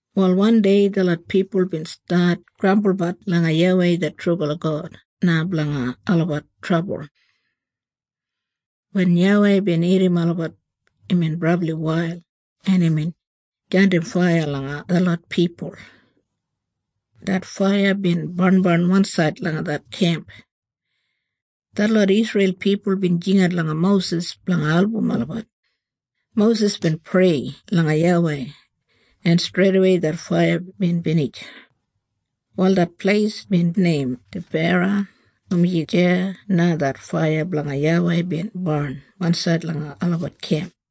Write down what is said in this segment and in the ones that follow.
Wal wandei detlot pipul bin stat grambulbat langa YAWEI det trubala God na blanga olabat trabul. Wen YAWEI bin irrim olabat imbin brabli wail en imbin jandim faiya langa detlot pipul. Det faiya bin barnbarn wansaid langa det kemp. Detlot Isreil pipul bin jingat langa Mosis blanga album olabat. Mosis bin prei langa YAWEI en streidawei det faiya bin binij. Wal det pleis bin neim Tebera, dumaji deya na det faiya blanga YAWEI bin barn wansaid langa olabat kemp.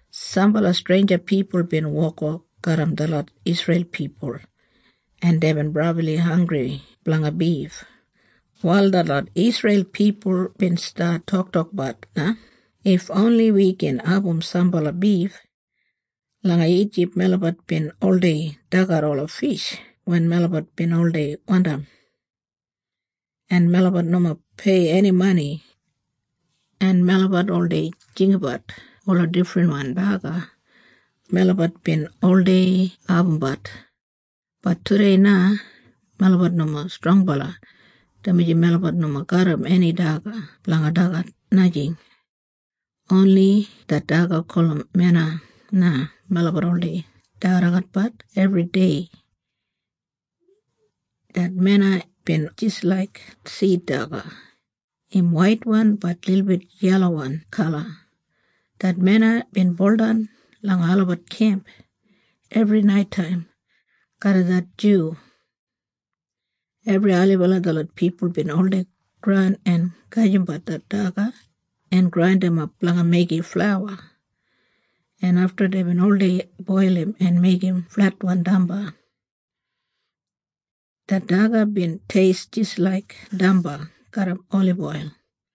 Sambala streinja pipul bin wokwok garram detlot Isreil pipul, en deibin brabli hanggri blanga bif. Wal detlot Isreil pipul bin stat toktokbat na, “If oni wi gin abum sambala bif. Langa Ijip melabat bin oldei dagat ola fish wen melabat bin oldei wandim, en melabat nomo pei eni mani. En melabat oldei jinggabat ola difrinkain daga melabat bin oldei abumbat. Bat tudei na melabat nomo strongbala. Dumaji melabat nomo garram eni daga blanga dagat. Najing. Oni det daga gulum mena na melabat oldei dagadagatbat ebridei.” Det mena bin jis laik sid daga, im waitwan bat lilbit yelawan kala. Det mena bin buldan langa olabat kemp ebri naitaim garram det dyu. Ebri ailibala detlot pipul bin oldei goran en gajimbat det daga en grandimap blanga meigim flauwa, en afta deibin oldei boilim en meigim fletwan damba. Det daga bin teist jis laik damba garram oliboil.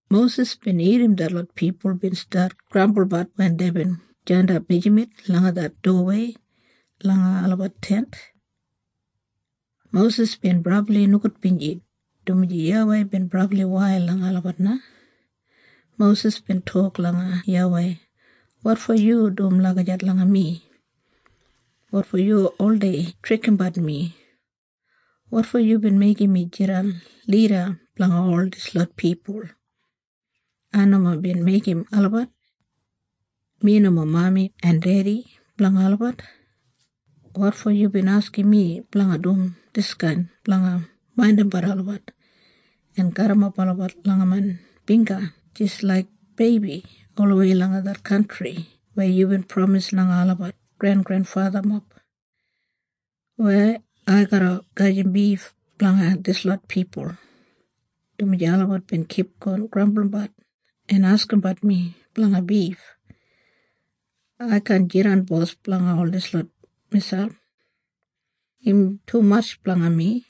Mosis bin irrim detlot pipul bin stat grambulbat wen deibin jandap mijamet langa det dowawei langa olabat tent. Mosis bin brabli nogudbinji, dumaji YAWEI bin brabli wail langa olabat na. Mosis bin tok langa YAWEI, “Wotfo yu dum lagijat langa mi? Wotfo yu oldei trikimbat mi? Wotfo yubin meigim mi jidan lida blanga ol dislot pipul? Ai nomo bin meigim olabat. Mi nomo mami en dedi blanga olabat. Wotfo yubin askim mi blanga dum diskain blanga maindimbat olabat, en garrimap olabat langa main bingga jis laik beibi olawei langa det kantri weya yubin pramis langa olabat grengrenfathamob? Weya ai garra gajim bif blanga dislot pipul? Dumaji olabat bin kipgon grambulbat en askimbat mi blanga bif. Ai kaan jidan bos blanga ol dislot miselp. Im tumatj blanga mi!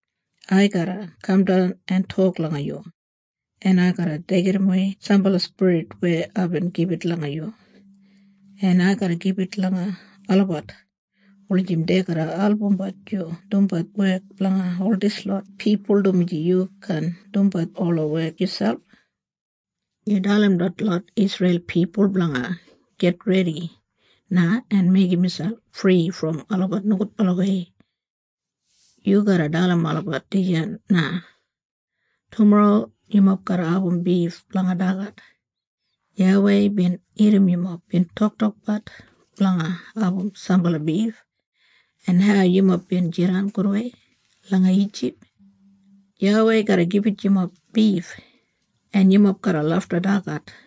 Ai garra kamdan en tok langa yu, en ai garra deigimwei sambala spirit weya aibin gibit langa yu, en ai garra gibit langa olabat wulijim dei garra albumbat yu dumbat wek blanga ol dislot pipul dumaji yu kaan dumbat ola wek yuselp. Yu dalim detlot Isreil pipul blanga gitredi na en meigim miselp fri brom olabat nogudbalawei. Yu garra dalim olabat dijan na. ‘Tumorro, yumob garra abum bif blanga dagat. YAWEI bin irrim yumob bin toktokbat blanga abum sambala bif, en hau yumob bin jidan gudwei langa Ijip. YAWEI garra gibit yumob bif, en yumob garra lafta dagat.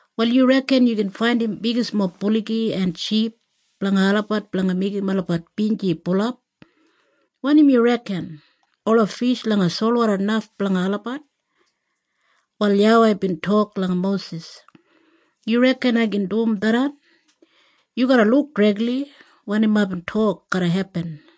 Wal yu reken yu gin faindim bigismob buligi en ship blanga olabat blanga meigim olabat binji bulap? Wanim yu reken? Ola fish langa solwoda naf blanga olabat?” Wal YAWEI bin tok langa Mosis, “Yu reken ai kaan dum tharran? Yu garra luk dregli wanim aibin tok garra hepin!”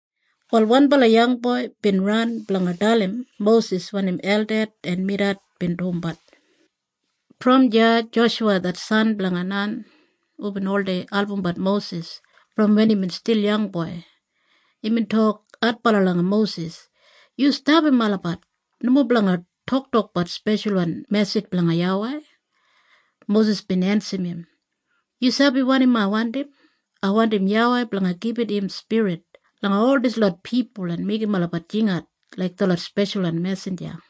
Wal wanbala yangboi bin ran blanga dalim Mosis wanim Elded en Medad bin dumbat. Brom deya Joshuwa det san blanga Nan, hubin oldei albumbat Mosis brom wen imbin stil yangboi, imbin tok adbala langa Mosis, “Yu stapam olabat nomo blanga toktokbat speshalwan mesij blanga YAWEI.” Mosis bin ensim im, “Yu sabi wanim ai wandim? Ai wandim YAWEI blanga gibit im spirit langa ol dislot pipul en meigim olabat jingat laik detlot speshalwan mesinja.”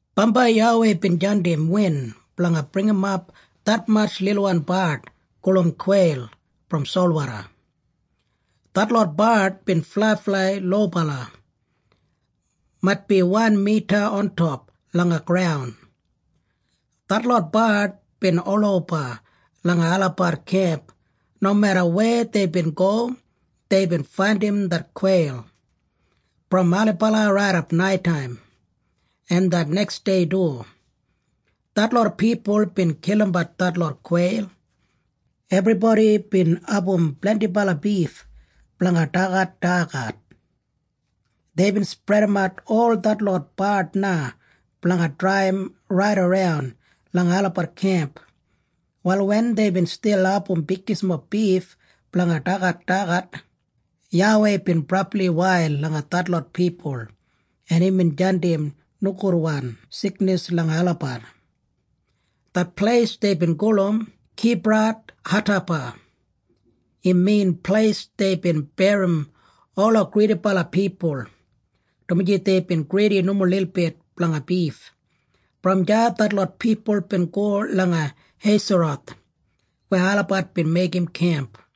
Bambai YAWEI bin jandim win blanga bringimap detmatj lilwan bard gulum kweil brom solwoda. Detlot bard bin flaiflai lobala, maitbi wan mita ontop langa graun. Detlot bard bin oloba langa olabat kemp nomeda weya deibin go deibin faindim det kweil. Brom ailibala raidap naitaim en det neksdei du, detlot pipul bin kilimbat detlot kweil. Ebribodi bin abum blendibala bif blanga dagadagat. Deibin spredimat ol detlot bard na blanga draiyim raidaran langa olabat kemp. Wal wen deibin stil abum bigismob bif blanga dagadagat, YAWEI bin brabli wail langa detlot pipul en imbin jandim nogudwan siknis langa olabat. Det pleis deibin gulum Kibrathataba. Im min Pleis Deibin Berrim Ola Gridibala Pipul, dumaji deibin gridi nomo lilbit blanga bif. Brom deya detlot pipul bin go langa Heiseroth weya olabat bin meigim kemp.